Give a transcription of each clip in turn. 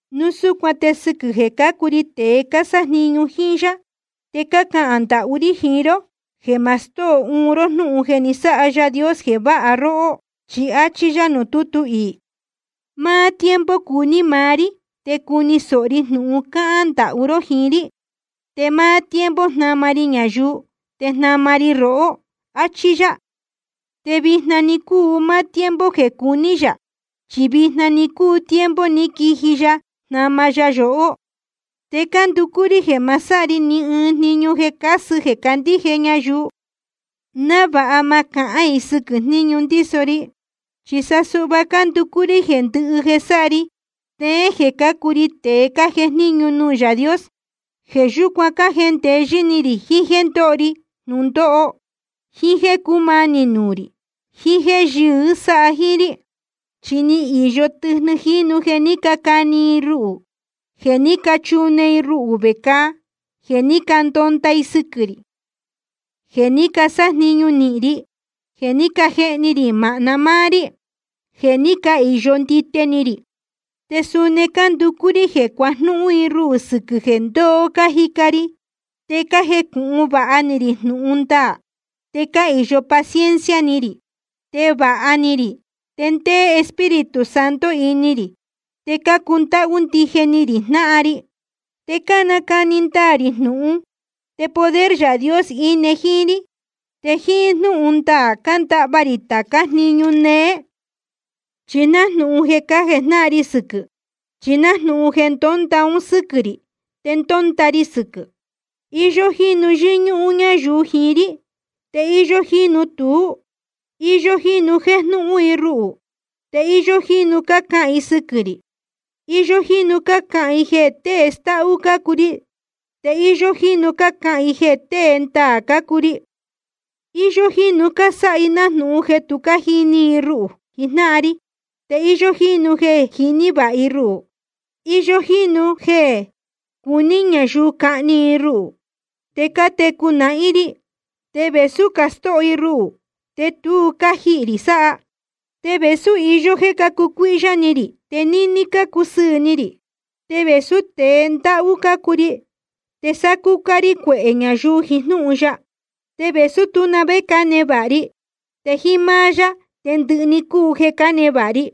Núu súcuan te sɨquɨ̄ jeē cácuu ri tēe cásájniñu jíín yá, te cácahān ndahú rí jiín ró jeē ma stóo uun ró jnúhun jeē ni sáha Yaā Dios jeē váha róhó. Chi áchí yá nuū tútu iī: Máá tiempo cuní maá rí te cuni sōho rí jnūhun cáhán ndahú ró jiín rí. Te máá tiempo jnáma ri ñayuu, te jnama ri rohó. Achí yá. Te vijna‑ni cúu máá tiempo jeē cuní yā, chi vijna‑ni cúu tiempo ni quiji Yaā jnáma yóhó. Te cánducú rí jeē ma sáha ri ni ɨɨn jniñu jeē casɨ jeē candíje ñayuu, návāha ma cahán i sɨquɨ̄ jníñu ndíso ri. Chi sa suhva cánducú rí jeē ndɨhɨ jeē sáha ri, steén jeē cácuu ri tēe cájejníñu nuū Yaā Dios. Jeē yúcuan cájendeyɨ́ ni rī jiín jéē ndóho ri jnūndóho, jíín jéē cúmanī nuū rī, jiín jéē yɨɨ́ sáha jíín rí. Chi ni īyo tɨjnɨ jínu jeē ní cacani i ruhū, jeē ní cachune i ruhū vecāa, jeē ní candonda i sɨquɨ̄ rī, jeē ní casájniñu nīhin ri, jeē ní cajehni rī māhna máá rí, jeē ní cahīyo ndite ni rī. Te suni cánducú rí jeē cuajnúhún i ruhū sɨquɨ̄ jeē ndoo cájica ri, te cájecūhun vāha ni rī jnūhun ndaā, te cáhīyo paciencia ni rī, te vāha ni rī, te ndéé Espíritu Santo ini rī, te cácundáhú ndije ni rī jnáhan ri. Te cánacani ndaā rī jnūhun, te poder Yaā Dios íne jíín rí. Te jíín jnúhun ndaā cándahva rī tācá jniñu néé, chi nájnūhun jeē cájejnáhan ri sɨquɨ̄. Chi nájnūhun jeē ndónda un sɨ́quɨ̄ rī te ndónda ri sɨquɨ̄. Iyó jínu yɨ́ñúhún ñáyuu jiín rí, te íyó jínu tuú. Iyó jínu jéjnúhún i ruhū, te íyó jínu cácahān i sɨquɨ̄ rī. Iyó jínu cácahān i jeē tée stáhú cácuu ri, te íyó jínu cácahān i jeē tée ndaā cácuu ri. Iyó jínu cásáha i nájnūhun jeē tu jíní i ruhū jijnáhan ri, te íyó jínu jeē jiní vāha i ruhū. Iyó jínu jeē cuní ñayuu cahni i ruhū, te cátecu nahín rí. Te vēsú cástóho i ruhū, te tu cájihī rī sáha. Te vēsú iyó jéē cácucuíhyá ni rī, te níní cácusɨɨ̄ ni rī. Te vēsú tēe ndáhú cácuu ri, te sácúcá rí cuehē ñayuu jiín jnúhun ya. Te vēsú tú na vé cánevāha ri, te jíín máá yá te ndɨhɨ‑ni cúu jeē cánevāha ri.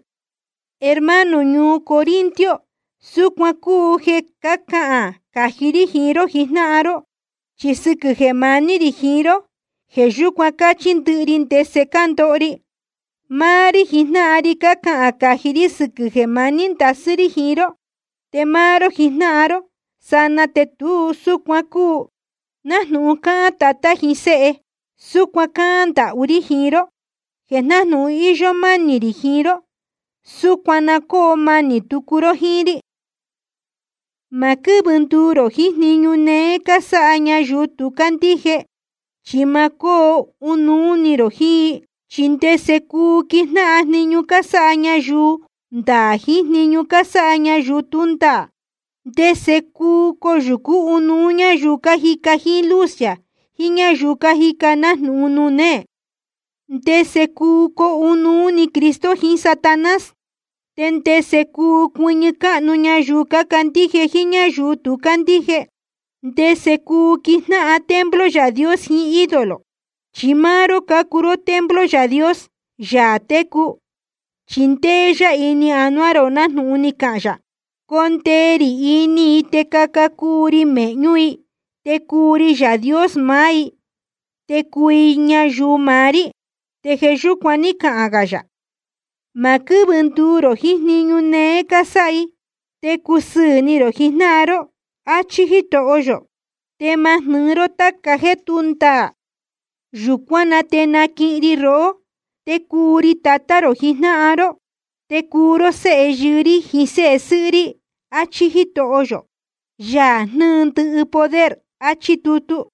Hermano ñuu Corinto, súcuan cúu jeē cácahān cají rí jiín ró jijnáhan ró, chi sɨquɨ̄ jeē maní rī jiín ró, jeē yúcuan cáchí ndɨhɨ ri ndese cándoho ri. Máá rí jijnáhan ri cácahān cají rí sɨquɨ̄ jeē maní ndasɨ́ rí jiín ró, te máá ró jijnáhan ró sanaa te tu súcuan cúu. Nájnūhun cáhán tatá jiín séhe, súcuan cáhán ndahú rí jiín ró jeē nájnūhun íyó mánī rī jiín ró, súcuan na cóo manī tucu ró jíín rí. Ma quɨ́vɨ nduu rō jiín jniñu néé cásáha ñayuu tu cácandíje, chi ma cúu coo ɨnuú ró jíín i. ¿Chi ndese cuu quijnáhan jniñu cásáha ñayuu ndaā jiín jniñu cásáha ñayuu tú ndaā? ¿Te ndese cuu coyūcú ɨnuú ñáyuu cájica jíín luz yā jiín ñáyuu cájica nájnūhun nuū néē? ¿Ndese cuu coo ɨnuú ni Cristo jiín Satanás? ¿Te ndese cuu cuɨñɨ cáhnu ñayuu cácandíje jíín ñáyuu tu cácandíje? ¿Te ndese cuu quijnáhan templo Yaā Dios jiín ídolo? Chi máá ró cácuu templo Yaā Dios, Yaā técu, chi ndéé yá ini anuá rō, nájnūhun ni cahān yā: Condee rī ini i te caca cuu ri mēhñú i, te cuu ri Yaā Dios maá i, te cuu i ñayuu maá rí. Te jeē yúcuan ní cahān gā yā: Ma quɨ́vɨ nduu rō jiín jniñu néé cásáha i, te cusɨ́ɨn ró jijnáhan ró, áchí Jítoho yō. Te ma jnɨ́ɨ ró tāca jéē tú ndaā. Yūcuán na te naquihin ri rohó, te cuu ri Tatá rō jijnáhan ró, te cuu ró séhe yɨɨ́ rí jiín séhe sɨ́hɨ́ rí, áchí Jítoho yō, Yaā jnɨ́ɨ ndɨhɨ poder. Achí tutu.